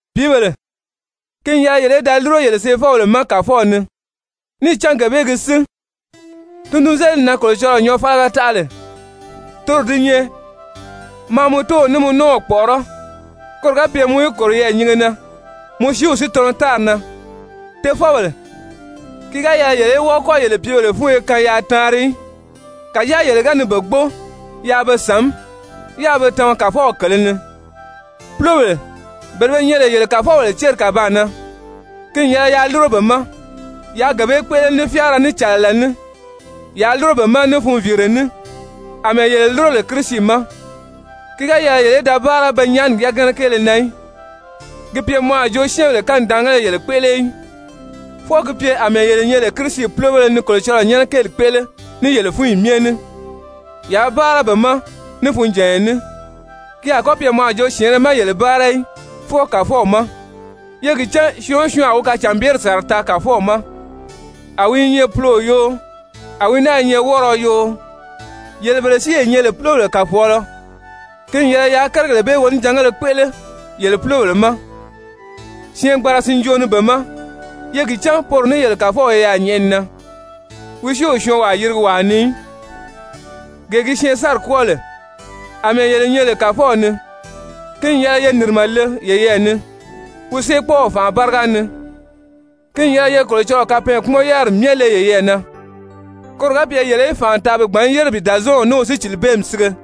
Pìíbèle, ki n yɛlɛ yele í da lúro yele seefɔbèle ma Kàfɔw ni, níì cán gee bee gi sín. Tundunzelidi na Kolocɔlɔɔ nyɔɔfaliga taʔa lè, toro di nyɛ: «Maa mɔ tóow ní mɔ nɔ́ɔw kpɔ̀ʔɔrɔ́ koro ga pye mɔ í kòro yɛɛ̀nyinge na, mɔ siiw si tɔnɔ tári na.» Tofɔbèle, ki ga yɛlɛ yele í wɔ́ɔ kɔ́ yele pìíbèle fúnyo kaan yaa taanri í. Kàjáa yele ga ni be gbóo yaa be sàmí, yáā be tama Kàfɔw kèlē ni. Púlobèle, bele be nyɛ lè yele kàfɔbèle céri kàbaan na, ki n yɛlɛ yaa lúro be ma. Yaa gee bee kpéʔele ní fyáara, ní cɛ̀lɛlɛ ní, yaa lúro be ma ní funviire ní, àmɛɛ yele lúro lè Kirisi ma. Ki ga yɛlɛ yele í da báara pe nyaani yagana kéele na í, ki pye mɔ a jo syɛ́ɛnbèle kanidaangéle yele kpéʔele í, fwɔɔ gi pye àmɛɛ yele nyɛ lè Kirisi púlobéle ni Kolocɔlɔɔ nyɛ́nɛ kéeli kpéʔele ní yele fúnyi myɛ ní. Yaa báara be ma ní funjànya ní, ki a kɔ́ pye mɔ a jo syɛ̀ɛnnɛ má yele báara í, fwɔɔ Kàfɔw ma. Ye gi cán syɔɔn o syɔɔn a wi kacànbyeri sàra taa Kàfɔw ma, a wi i nyɛ puloo yoo, a wi náa i nyɛ wɔ́rɔɔ yoo. Yele bele si ye nyɛ lè púlobèle kàfɔɔlɔ, ki n yɛlɛ yaa kérigèle bee wonijangéle kpéʔele yele púlobèle ma syɛɛngbanra sinjoo ni be ma. Ye gi cán poro ní yele Kàfɔw i yaà nyɛ̀ʔɛni na, wi si o syɔɔnwaa yirigi wàa ni í. Gee gi syɛɛnsanri kwɔ́ɔ lè, àmɛɛ yele nyɛ lè Kàfɔw ni, ki n yɛlɛ ye nìrimɛ le yeyɛɛ ni wi séekpɔɔw fànʔa báriga ni. Ki n yɛlɛ ye Kolocɔlɔɔ kapɛɛnkpumɔn-yáriri myɛ le yeyɛɛ na koro ga pye yele í fànʔa taa bi gbǎn yére bi Dàzɔɔnw ní wi sícilibeemi sige.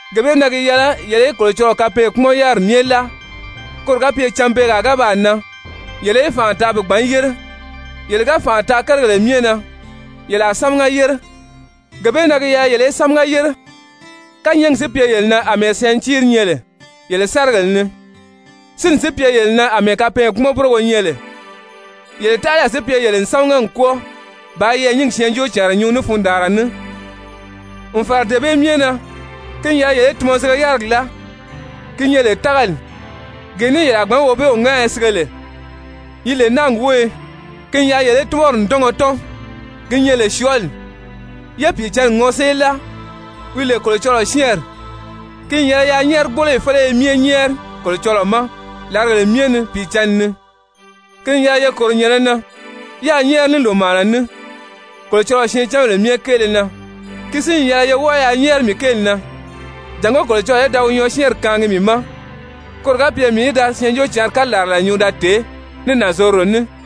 Gee bee na gi yɛlɛ yele í Kolocɔlɔɔ kapɛɛnkpumɔn-yáriri myɛ láa koro ga pye cânbeegaa ga baa nan yele í fànʔa taa bi gbǎn yére, yele ga fànʔa taa kérigèle myɛ na, yele a sámaga yére. Gee bee na gi yɛlɛ yele í sámaga yére, kányɛɛgi si pye yele na àmɛɛ sɛntiiri nyɛ lè yele sárigèle ni, sínni si pye yele na àmɛɛ kapɛɛnkpumɔn-búrogo nyɛ lè, yele taʔalayi si pye yele n sámaga n kwɔ́ɔ bàā yɛɛ̀nyingi syɛɛnjóocànra nyuu ní fundaanra ní. N fàra dee bee myɛ na ki n yɛlɛ yele í tunmɔzige-yárigi láa ki nyɛ lè tágali, gee ní yele a gbǎn Wobeew ŋáaya sige lè, yi lè náagi wóyo. Ki n yɛlɛ yele í túnmɔri ǹdɔngɔ tɔ́n ki nyɛ lè syɔɔli, yé Pìicǎnni ŋɔsée láa wi lè Kolocɔlɔɔ syɛ́ɛnri. Ki n yɛlɛ yaa nyɛ́ɛrigboloyi féleye myɛ nyɛ́ɛri Kolocɔlɔɔ ma làrigèle myɛ ni Pìicǎnni ni. Ki n yɛlɛ ye kòro nyɛ̀nɛ na yáā nyɛ́ɛri ní lòmaana ní Kolocɔlɔɔ syɛɛncanbèle myɛ kéele na. Ki si n yɛlɛ ye wɔ́ɔ yaa nyɛ́ɛri mii kéeli na jàngó Kolocɔlɔɔ í da nyɔɔsyɛɛnri kaangi mii ma koro ga pye mii í da Syɛɛnjóocǎnri kalarala nyuu da tèé ní nànzorodo ní.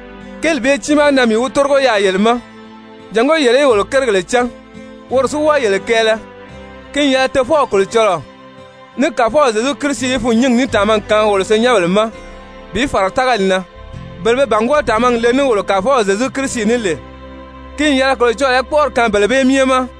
Kéeli bee tiimaa na mii wi tórigo yaà yele ma jàngó yele í wolo kérigèle cán, woro si wɔ́ɔ yele kɛɛlɛ. Ki n yɛlɛ Tofɔw Kolocɔlɔɔ ní Kàfɔw Zyezu Kirisi í fûnnyingi ní tàmagi kaan wolo senyɛnbèle ma bi fàra tágali na. Bele be bàngwɔɔ tàmagi le ní wolo Kàfɔw Zyezu Kirisi ní lè, ki n yɛlɛ Kolocɔlɔɔ í kpɔ́ʔɔri kaan bele bee myɛ ma!